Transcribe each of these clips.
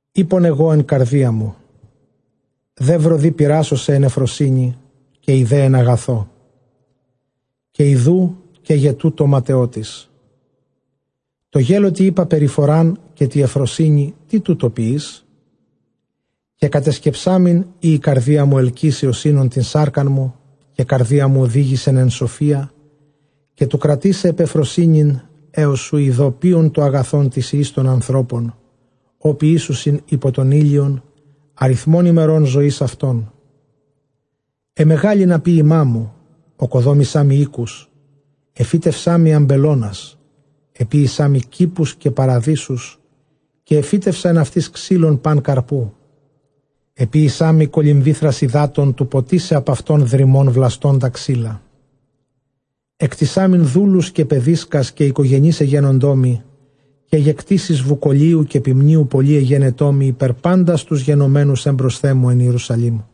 Εἶπον ἐγὼ ἐν καρδίᾳ μου, δεῦρο δὴ πειράσω σε ἐν εὐφροσύνῃ, καὶ ἴδε ἐν ἀγαθῷ· καὶ ἰδοὺ καί γε τοῦτο ματαιότης. Τῷ γέλωτι εἶπα, περιφορὰν, καὶ τῇ εὐφροσύνῃ, τί τοῦτο ποιεῖς; Καὶ κατεσκεψάμην εἰ ἡ καρδία μου ἑλκύσει ὡς οἶνον τὴν σάρκα μου, καὶ καρδία μου ὡδήγησεν ἐν σοφίᾳ, καὶ τοῦ κρατῆσαι ἐπʼ εὐφροσύνην, ἕως οὗ ἴδω ποῖον τὸ ἀγαθὸν τοῖς υἱοῖς τῶν ἀνθρώπων, ὃ ποιήσουσιν ὑπὸ τὸν ἥλιον, ἀριθμὸν ἡμερῶν ζωῆς αὐτῶν. Ἐμεγάλυνα ποίημἀ μου, ᾠκοδόμησά μοι οἴκους, ἐφύτευσά μοι ἀμπελῶνας, ἐποίησά μοι κήπους καὶ παραδείσους, καὶ ἐφύτευσα ἐν αὐτοῖς ξύλον πᾶν καρποῦ. Ἐποίησά μοι κολυμβήθρας ὑδάτων τοῦ ποτίσαι ἀπʼ αὐτῶν δρυμὸν βλαστῶντα ξύλα. Ἐκτησάμην δούλους καὶ παιδίσκας, καὶ οἰκογενεῖς ἐγένοντό μοι, καί γε κτῆσις βουκολίου καὶ ποιμνίου πολλὴ ἐγένετό μοι ὑπὲρ πάντας τοὺς γενομένους ἔμπροσθέν μου ἐν Ἱερουσαλήμ.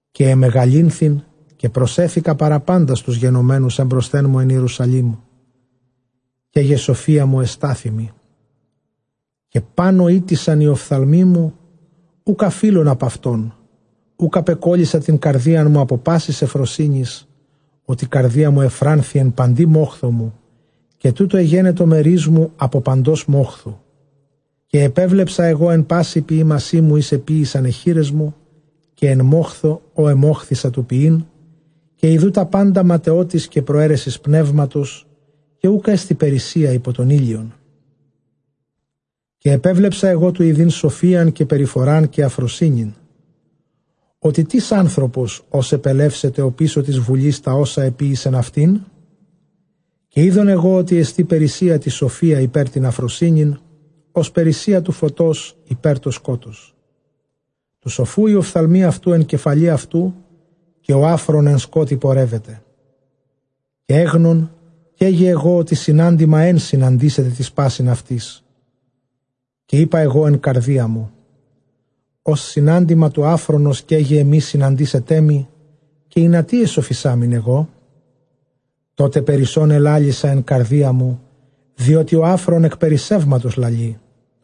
Καὶ ἐμεγαλύνθην καὶ προσέθηκα παρὰ πάντας τοὺς γενομένους ἀπὸ ἔμπροσθέν μου ἐν Ἱερουσαλήμ, καί γε σοφία μου ἐστάθη μοι. Καὶ πᾶν ὃ ᾔτησαν οἱ ὀφθαλμοί μου, οὐκ ἀφεῖλον ἀπʼ αὐτῶν· οὐκ ἀπεκώλυσα τὴν καρδίαν μου ἀπὸ πάσης εὐφροσύνης μου, ὅτι καρδία μου εὐφράνθη ἐν παντὶ μόχθῳ μου· καὶ τοῦτο ἐγένετο μερίς μου ἀπὸ παντὸς μόχθου μου. Καὶ ἐπέβλεψα ἐγὼ ἐν πᾶσι ποιήμασί μου οἷς ἐποίησαν αἱ χεῖρές μου, καὶ ἐν μόχθῳ ᾧ ἐμόχθησα τοῦ ποιεῖν, καὶ ἰδοὺ τὰ πάντα ματαιότης καὶ προαίρεσις πνεύματος, καὶ οὐκ ἔστι περίσσεια ὑπὸ τὸν ἥλιον. Καὶ ἐπέβλεψα ἐγὼ τοῦ ἰδεῖν σοφίαν καὶ παραφορὰν καὶ ἀφροσύνην, ὅτι τίς ἄνθρωπος ὅς ἐπελεύσεται ὀπίσω τῆς βουλῆς; τὰ ὅσα ἐποίησεν αὐτήν. Καὶ εἶδον ἐγὼ ὅτι ἐστὶ περίσσεια τῇ σοφίᾳ ὑπὲρ τὴν ἀφροσύνην, ὡς περίσσεια τοῦ φωτὸς ὑπὲρ τὸ σκότος. Τοῦ σοφοῦ οἱ ὀφθαλμοὶ αὐτοῦ ἐν κεφαλῇ αὐτοῦ, καὶ ὁ ἄφρων ἐν σκότει πορεύεται· καὶ ἔγνων καί γε ἐγὼ, ὅτι συνάντημα ἓν συναντήσεται τοῖς πᾶσιν αὐτοῖς. Καὶ εἶπα ἐγὼ ἐν καρδίᾳ μου, ὡς συνάντημα τοῦ ἄφρονος καί γε ἐμοὶ συναντήσεταί μοι, καὶ ἱνατί ἐσοφισάμην ἐγώ; περισσὸν ἐλάλησα ἐν καρδίᾳ μου, ὅτι καί γε τοῦτο ματαιότης, διότι ὁ ἄφρων ἐκ περισσεύματος λαλεῖ·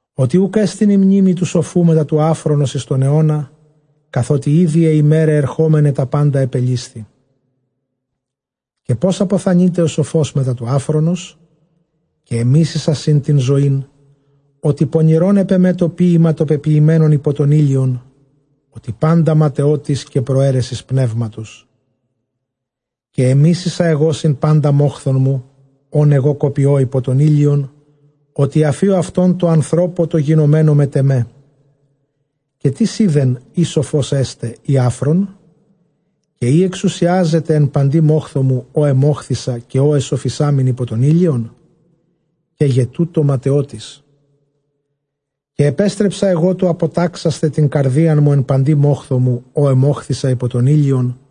Ὅτι οὐκ ἔστιν ἡ μνήμη τοῦ σοφοῦ μετὰ τοῦ ἄφρονος εἰς τὸν αἰῶνα, καθότι ἤδη αἱ ἡμέραι ἐρχόμεναι τὰ πάντα ἐπελήσθη· καὶ πῶς ἀποθανεῖται ὁ σοφὸς μετὰ τοῦ ἄφρονος; Καὶ ἐμίσησα σὺν τὴν ζωήν· ὅτι πονηρὸν ἐπʼ ἐμὲ τὸ ποίημα τὸ πεποιημένον ὑπὸ τὸν ἥλιον, ὅτι πάντα ματαιότης καὶ προαίρεσις πνεύματος. Καὶ ἐμίσησα ἐγὼ σύμπαντα μόχθον μου ὃν ἐγὼ κοπιῶ ὑπὸ τὸν ἥλιον, ὅτι ἀφίω αὐτὸν τῷ ἀνθρώπῳ τῷ γινομένῳ μετʼ ἐμέ. Καὶ τίς εἶδεν εἰ σοφὸς ἔσται ἢ ἄφρων; καὶ εἰ ἐξουσιάζεται ἐν παντὶ μόχθῳ μου, ᾧ ἐμόχθησα καὶ ᾧ ἐσοφισάμην ὑπὸ τὸν ἥλιον; καί γε τοῦτο ματαιότης. Καὶ ἐπέστρεψα ἐγὼ τοῦ ἀποτάξασθαι τὴν καρδίαν μου ἐν παντὶ μόχθῳ μου ᾧ ἐμόχθησα ὑπὸ τὸν ἥλιον·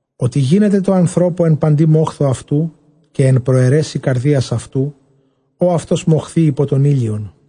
ὅτι γίνεται ἐν τῷ ἀνθρώπῳ ἐν παντὶ μόχθῳ αὐτοῦ καὶ ἐν προαιρέσει καρδίας αὐτοῦ ᾧ αὐτὸς μοχθεῖ ὑπὸ τὸν ἥλιον.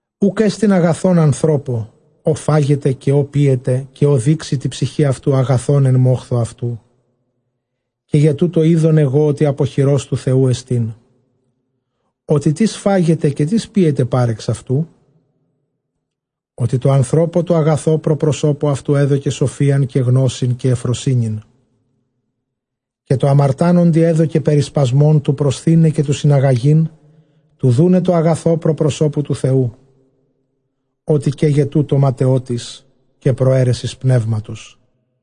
Οὐκ ἔστιν ἀγαθὸν ἀνθρώπῳ, ὃ φάγεται καὶ ὃ πίεται καὶ ὃ δείξει τῇ ψυχῇ αὐτοῦ ἀγαθὸν ἐν μόχθῳ αὐτοῦ· καί γε τοῦτο εἶδον ἐγὼ ὅτι ἀπὸ χειρὸς τοῦ Θεοῦ ἐστιν· Ὅτι τίς φάγεται καὶ τίς πίεται πάρεξ αὐτοῦ; Ὅτι τῷ ἀνθρώπῳ τῷ ἀγαθῷ πρὸ προσώπου αὐτοῦ ἔδωκε σοφίαν καὶ γνῶσιν καὶ εὐφροσύνην, καὶ τῷ ἁμαρτάνοντι ἔδωκε περισπασμὸν τοῦ προσθεῖναι καὶ τοῦ συναγαγεῖν, τοῦ δοῦναι τῷ ἀγαθῷ πρὸ προσώπου τοῦ Θεοῦ, ὅτι καί γε τοῦτο ματαιότης καὶ προαίρεσις πνεύματος.